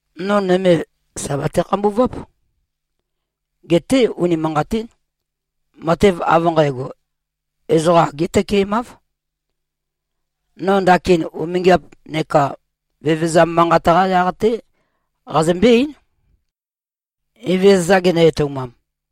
No nøme, sà bate-khambuváp. Geté, unimanqatín, matev av nqægo, ezoqa agé tøkemáv. No ndakin umingiap neka vevezam manqat-qá yaq-té qazømbé-eín, Evezøza genø-etoumam.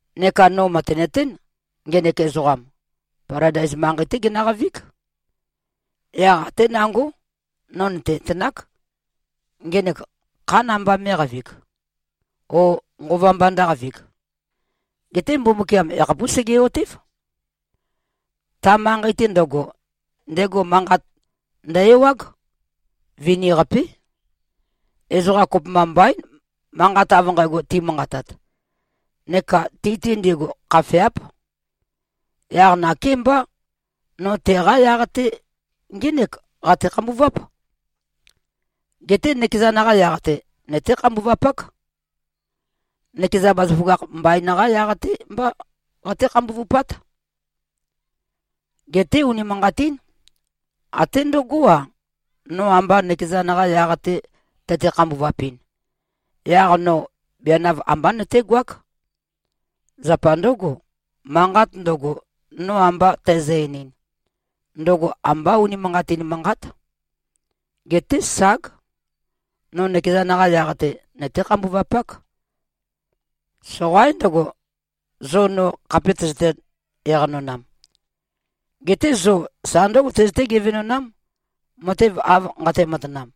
Neka no mø̀tenøtén, ngenek ezoqam, Paladais manqei-té genøqavíg. Yaq até nangó, no nø̀tenøtenák, ngenek khá namba mé꞉qavig, ó, nqova mba ndǿqavig. Geté Mbumbukiam yakhapús sege꞉-otév. Ta manqei-te ndøgo, ndego manqat ndø-ewág. Vini-qapé. Ezoqa kopømba mbaín, manqat av nqægo timanqatat. Neka ti-te ndigu, khafeáp. Yaq nakémbá, no teqá yaq-te ngének qate-khambuváp. Geté nøkezan-qa yaq-te, nøté-khambuvapák. Nøkeza bazaføgakh mbain-qá yaq-te mbá qaté-khambuvupát. Geté unimanqatín. Até ndǿgo-a, no amba nøkezan-qa yaq-te tøte-khambuvapin, yaq no bianav ambá nøtégoák. Zapa ndǿgo, manqat ndøgo, no amba tæzø-einin, ndøgo ambá unimanqatin manqát. Geté ság. No nøkezan-qa yaq-te, nøté-khambuvapák. Soqaín ndøgo, zo no khape tøzøte-eqanonam. Geté zo sa ndǿgo tøzøté-gevenonám, matev av nqate-matanam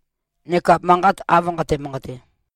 neka manqat av nqate-manqate.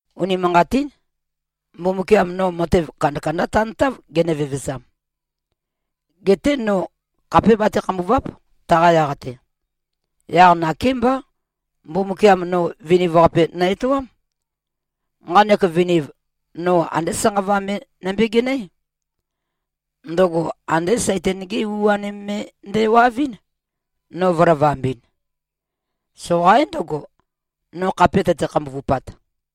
Unimanqatín. Mbumbukiam no matev kandakandá tantáv genø-vevezam. Geté no khapé bate-khambùva᷄p, taqa yaq-te. Yaq nakémbá, Mbumbukiam no viniv-qape nø-etoám. Nqanek viniv, no andé sanqava me nømbegenøé. Ndøgo andé Saitan-gé u-anim me ndæwavɨ́n, no vø̄lavambɨn. Soqaín ndøgo, no khape tøte-khambuvupat.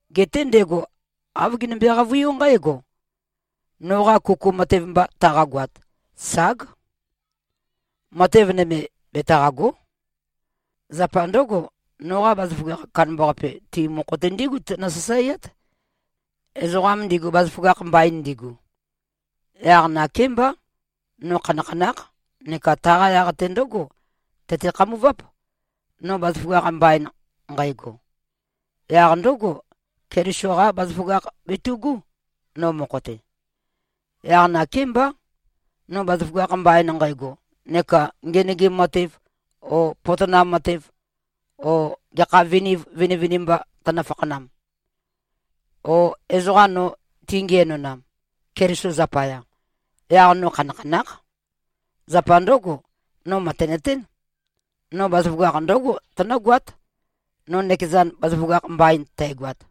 Geté ndego āv genømbe-qavøiú nqǽgo, “Noqa kuku matev mba taqagoat, ság. Matev nøme betaqàgo᷄. Zapa ndǿgo, noqa bazaføgakh, kandambaqape ti mokho-te ndígu tønø-sasaeát, ezoqa ndigu bazaføgakh mbain ndigu.” Yaq nakémbá, no khanakhanákh neka taqa yaq-te ndǿgo tøte-khambuváp, no bazaføgakh mbain nqægo. Yaq ndǿgo, Keliso-qá bazaføgakh betu꞉gú, no mokho-te. Yaq nakémbá, no bazaføgakh mbain nqægo neka ngenøgim matev o potonam matev o gekha viniv vinivinimba tønø-fakhanam, o ezoqa no tingiænonam, Keliso zapaya, yaq no khanakhanákh. Zapa ndǿgo, no mø̀tenøtén. No bazaføgakh ndǿgo tønǿgoát, no nøkezan bazaføgakh mbain tægoat.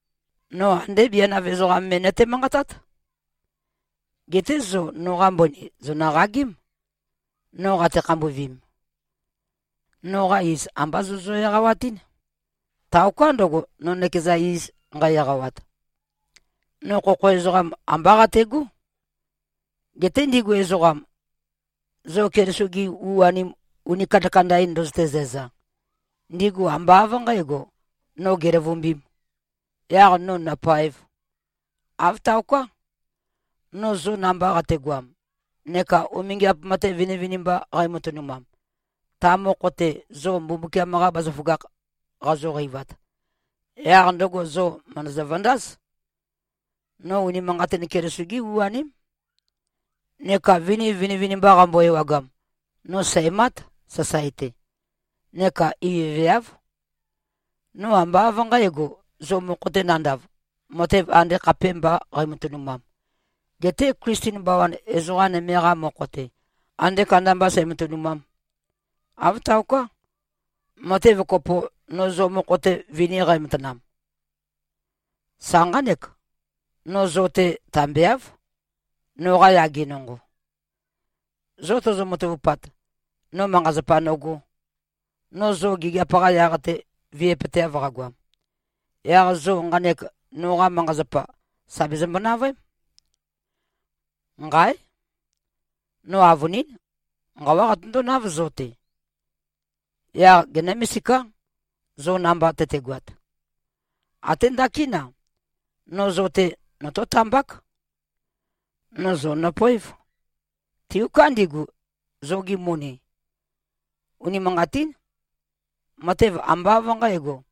No andé bianav ezoqam me nøte-manqatát. Geté zo noqa mbøni, zònøqagém, no qate-khambuvim. Noqa iz, ambá zō zø-eqawatɨ́n, taoká ndøgo, no nøkeza iz nqæ-eqawat. No khokho ezoqam ambá qategó. Geté ndigu ezoqam, zo Keliso-gi u-anim uni kandakanda-in ndøzøte-zæza, ndigu ambá av nqǣgo, no gèløvumbīm, yaq no nopaēv. Āv taoká. No zo namba qategoam, neka umingiap matev vinivinimba qæmatønumam, ta mokho-te zo Mbumbukiam-qa bazaføgakh qazoqeivat, yaq ndøgo zo mø̀ndøzø-vøndáz, no unimanqatin Keliso-gé u-aném. Neka viniv vinivinimba qambo-ewagam, no sæ̀mát, sasae-te. Neka ivøveáv. No ambá av nqǣgo, zo mokho-te nandav, matev andē khapēmbā qæmatønumam, getē Klisten bawan ezoqa nøme-qa mokho-te, andē kandambā sæmatønumām. Āv taoká. Matev kopo, no zo mokho-te vini qæmatanam, sa nqánek: No zo-te tambeáv, noqa yage nonqo. Zo tozo-matavupat, no manqa-zapa nogō, no zo gigiap-qa yaq-te viøpøteav qagoam, yaq zo nqanek noqa manqa-zapa, sà bezømbo-navøém. Nqáe! No avønín, nqawá qatøndónáv zo-te. Yaq genǿ-misiká, zo namba tøtegoat. Até ndakín-a, no zo-te notó-tambák. No zo nøpoév, tiuká ndigu, zogi moni. Unimanqatín. Matev ambá av nqǣgo,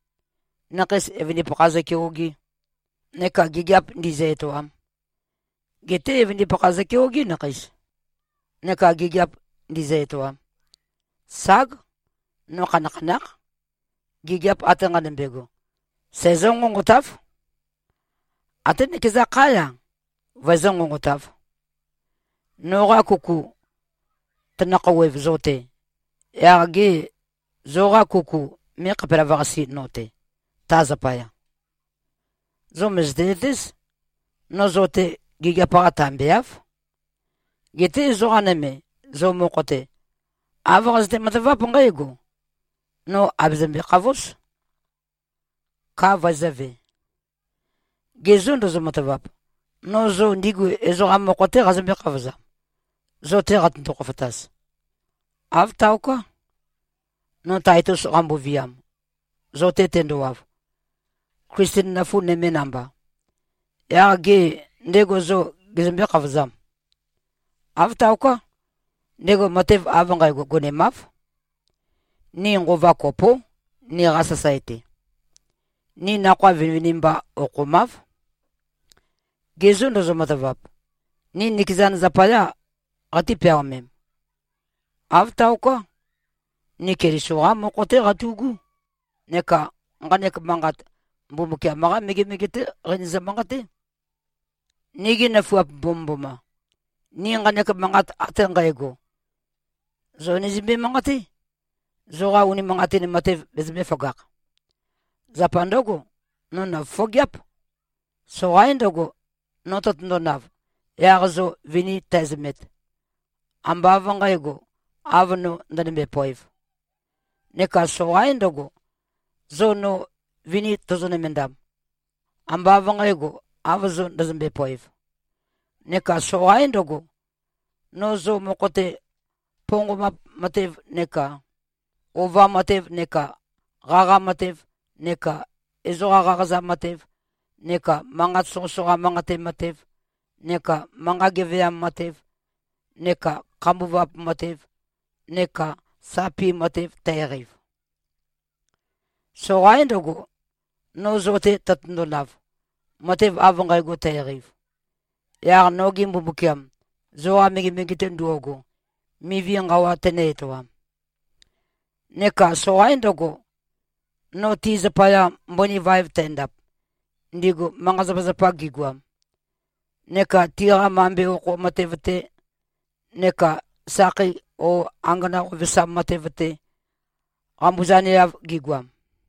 nakheis evøndipakha zøkeogē neka gigiap ndīzø̄-etōām. Geté evøndipakha zøkeogé, nakheis, neka gigiap ndīzø̄-etōām. Ság, no khanakhanákh. Gigiap ate nqanømbe꞉go, sæzǿ-nqonqotáv. Até nøkeza khá-ya, vøezǿ-nqonqotāv. Noqa kuku tønø-khouwev zo-te, yaq gê, zoqa kuku mé꞉-khapelavøqasē no-te, ta zapaya? Zo mø̀zøte-zøtéz, no zo-te gigiap-qa tambeáv. Geté ezoqa nøme, zo mokho-te, āv qazøte-mataváp nqǽgo: No àbøzømbe-khavóz, ka vøezø̄ve. Ge zô, ndozo-matavap, no zo ndigu ezoqa mokho-té qazømbé-khavozam, zo-te qatøndo-khofotaz? Āv taoká. No Taitus qamboviam, zo-te tendowav, Klisten nøfu nøme namba, yaq gê, ndego zo gezømbé-khavozam? Āv taoká. Ndego matev av nqægo gonemáv. Ni nqova kopó, niqa sasae-te. Ni nakhoa vinivinimba okhomáv. Ge zô, ndozo-matavap, ni nikezan zapayá qatí-peaomem? Āv taoká. Ni Keliso-qá mokho-té qatu꞉gú neka nqanek manqat, Mbumbukiam-qá megemege-té qeinøzø-manqaté. Nigi nøfuap mbomømboma! Ni nqanek manqat ate nqægo, zō nizømbe-manqaté, zoqa unimanqatin matev bezømbē-føgakh. Zapa ndǿgo, no nòfofogeáp. Soqaín ndøgo, no tøtøndonav, yaq zo vini tæzømet, ambā av nqǣgo, av no ndønømbe-poev. Neka soqaín ndøgo, zo no vini tozo-nømendam, ambā av nqǣgo, av zo ndøzømbe-poev. Neka soqaín ndøgo, no zo mokho-te ponqombap matev neka ova matev neka qaqa matev neka ezoqa qaqaza matev neka manqat soqøsoqa manqate matev neka manqa geveam matev neka khambuvap matev neka sapi matev tæqeiv. Soqaín ndøgo, no zo-te tøtøndonav, matev av nqægo tæqeiv, yaq noge Mbumbukiam zoqa megemege-te ndo꞉go, mivi nqawa tenø-etoam. Neka soqaín ndøgo, no ti zapaya mbøni vaev tændap, ndigu manqa-zapazapa gigoam, neka tiqa mambe okho matev-te neka sakhei o angana qovesam matev-te, qambuzaneav gigoam.